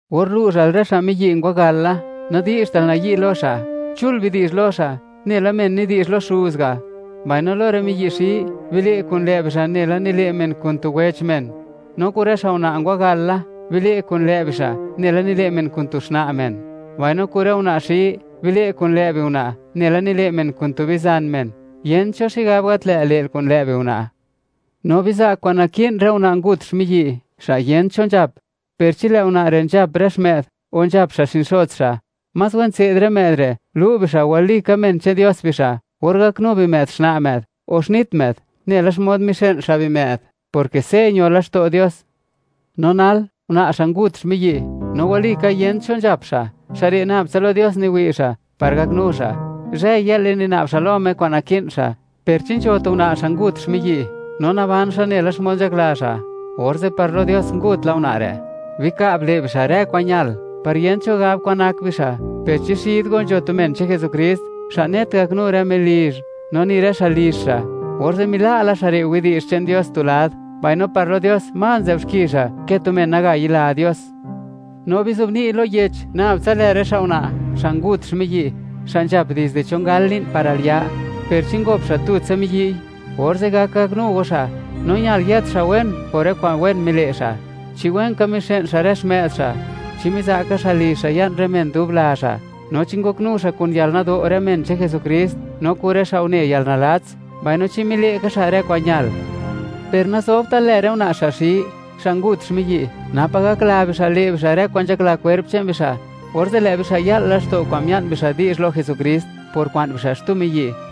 Or lu'zhal rë xa' miyi' ngwagal la, nadi'zhtal nayi' lo xa'; chul bidi'zh lo xa' nela men nidi'zh lo xuz ga'; mbaino lo rë miyi' xi, bile' kun lë' bixa' nela nile' men kun tu wech men. No kun rë xa' una' ngwagal la, bile' kun lë' bixa' nela nile' men kun tu xna' men; mbaino kun rë una' xi, bile' kun lë' biuna' nela nile' men kun tu bizan men; yent cho xigab gat lë't le'l kun lë' biuna'. No biza' kwa'n naki'n rë una' ngut xmiyi', xa' yent cho nzhap. Per chi lë' una' re' nzhap rë xmë'd o nzhap xa' xinxots xa', más wen tse'd rë më'd re' lu' bixa' walika men che'n Dios bixa' or gaknu bimë'd xna' më'd o xnit më'd, nela xmod mixë'n xa' bimë'd, porke se' ño laxto' Dios. No nal, una' xa' ngut xmiyi', no walika yent cho nzhap xa', xa' re' nab tsa lo Dios niwi' xa' par gaknu xa', zhë-yë'le nina'b xa' lo Me kwa'n naki'n xa'. Per chi nzho tu una' xa' ngut xmiyi', no naban xa' nela xmod nzhakla xa', orze' par lo Dios ngut la una' re'. Bika'b le' bixa' rë kwa'n ñal, par yent cho gab kwan nak bixa'. Per chi xid go nzho tu men che'n Jesukrist, xa' net gaknu rë melizh, no ni rë xa' lizh xa', orze' mila' la xa' re' widi'zh che'n Dios tu lad, mbaino par lo Dios, más nzë'b xki xa' ke tu men naga yila Dios. No bizobni' lo yech nab tsa lë rë xa' una', xa' ngut xmiyi', xa' nzhap dizde chon gal li'n par al ya, per chi ngop xa' tutsa miyi'; orze' gak gaknu go xa'. No ñal yët xa' wen por rë kwa'n wen mile' xa': Chi wen ka mixë'n xa' rë xmë'd xa', chi miza' ka xa' lizh xa' ya'n rë men dub la xa', no chi ngoknu xa' kun yalnado' rë men che'n Jesukrist, no kun rë xa' une yalnalats, mbaino chi mile' ka xa' rë kwa'n ñal. Per nazobtal lë rë una' xa' xi, xa' ngut xmiyi', napa' gakla bixa' le' bixa' rë kwa'n nzhakla kwerp che'n bixa', orze' lë' bixa' ya'l laxto' kwa'n mia'n bixa' di'zh lo Jesukrist por kwa'n bixa' xtu miyi',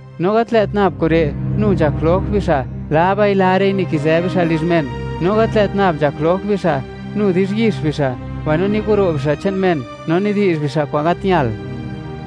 No gat lë't nab kure', nu nzhak jloj bixa': laba'i-lare'i nikizë bixa' lizh men; no gat lë't nab nzhak jloj bixa', nu di'zhyix bixa', mbaino niguro' bixa' che'n men no nidi'zh bixa' kwa'n gat ñal.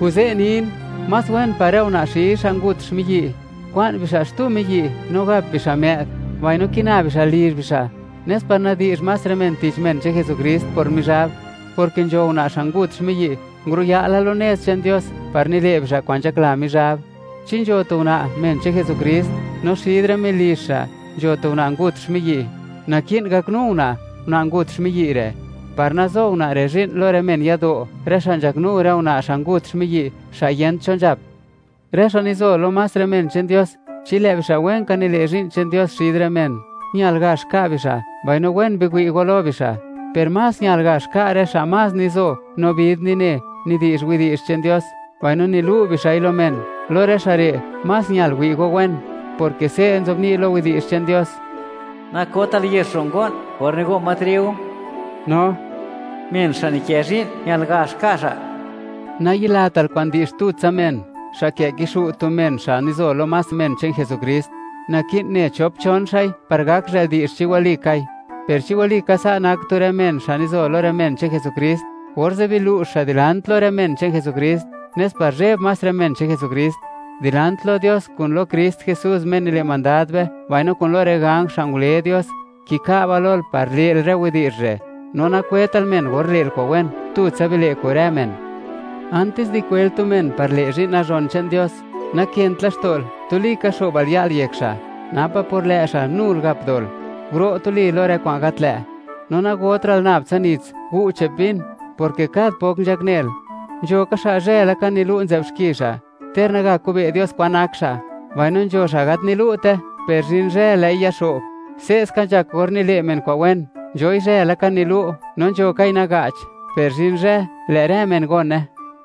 Kuze' nin, más wen par rë una' xi xa' ngut xmiyi', kwa'n bixa' xtu miyi' no gap bixa' më'd, mbaino kina bixa' lizh bixa', nes par nadi'zh más rë men tich men che'n Jesukrist por Mizhab, porke nzho una' xa' ngut xmiyi', nguro'ya' la lo nez che'n Dios par nile' bixa' kwa'n nzhakla Mizhab. Chi nzho tu una', men che'n Jesukrist, no xid rë melizh xa' nzho tu una' ngut xmiyi', naki'n gaknu una', una' ngut xmiyi' re', par nazo una' re' zhi'n lo rë men yado', rë xa' nzhaknu rë una' xa' ngut xmiyi', xa' yent cho nzhap. Rë xa' nizo lo más rë men che'n Dios, chi lë' bixa' wen ka nile' zhi'n nazhon che'n Dios xid rë men, ñal gax ka' bixa' mbaino wen biwi' go lo bixa'; per más ñal gax ka' rë xa' más nizo, no vid nine xa', nidi'zh widi'zh che'n Dios, mbaino nilu' bixa'i lo men; lo rë xa' re', más ñal wi' go wen, porke se' nzobni' lo Yech che'n Dios: “Nakotal yex ro' ngo'n or nigo' ma triu”, no: “Men xa' nikë zhi'n ñal gax ka' xa'.” Nayilatal kwa'n di'zh tutsa men, xa' kë' kixu' tu men xa' nizo lo más men che'n Jesukrist. Naki'n ne chop-chon xa'i par gak zhë'l di'zh chi walikai. Per chi walika sa' nak tu rë men xa' nizo lo rë men che'n Jesukrist, orze' bilu'zh xa' (biza' kunsej xa') dilant lo rë men che'n Jesukrist, nes par zheb más rë men che'n Jesukrist. Dilant lo Dios kun lo Krist Jesús, Me nile' mandad be; mbaino kun lo rë ganj xa' ngule Dios; kika'ba lol par le'l rë widi'zh re', no nakwetal men or le'l kwa'n wen; tutsa bile' kun rë men. Antis di kwel tu men par le' zhi'n nazhon che'n Dios, nakënt laxto'l, tuli ka xo'btal ya'l yek xa'; napa' por lë' xa', nul gap dol. ¡Guro' tuli lo rë kwa'n gat lë'! No nagotra'l nab tsa nits, gu' che'p vin, porke kad pok nzhaknel. Nzho ka xa', zhë laka nilu' nzë'b xki xa', ter naga kobe' (wi') Dios kwan nak xa'; mbaino nzho xa' gat nilu'te, per zhin zhë, lë'i yaxo'b. Se'ska nzhak or nile' men kwa'n wen; nzhoi zhë laka nilu' no nzho kai naga'ch, per zhin zhë, lë' rë men gone.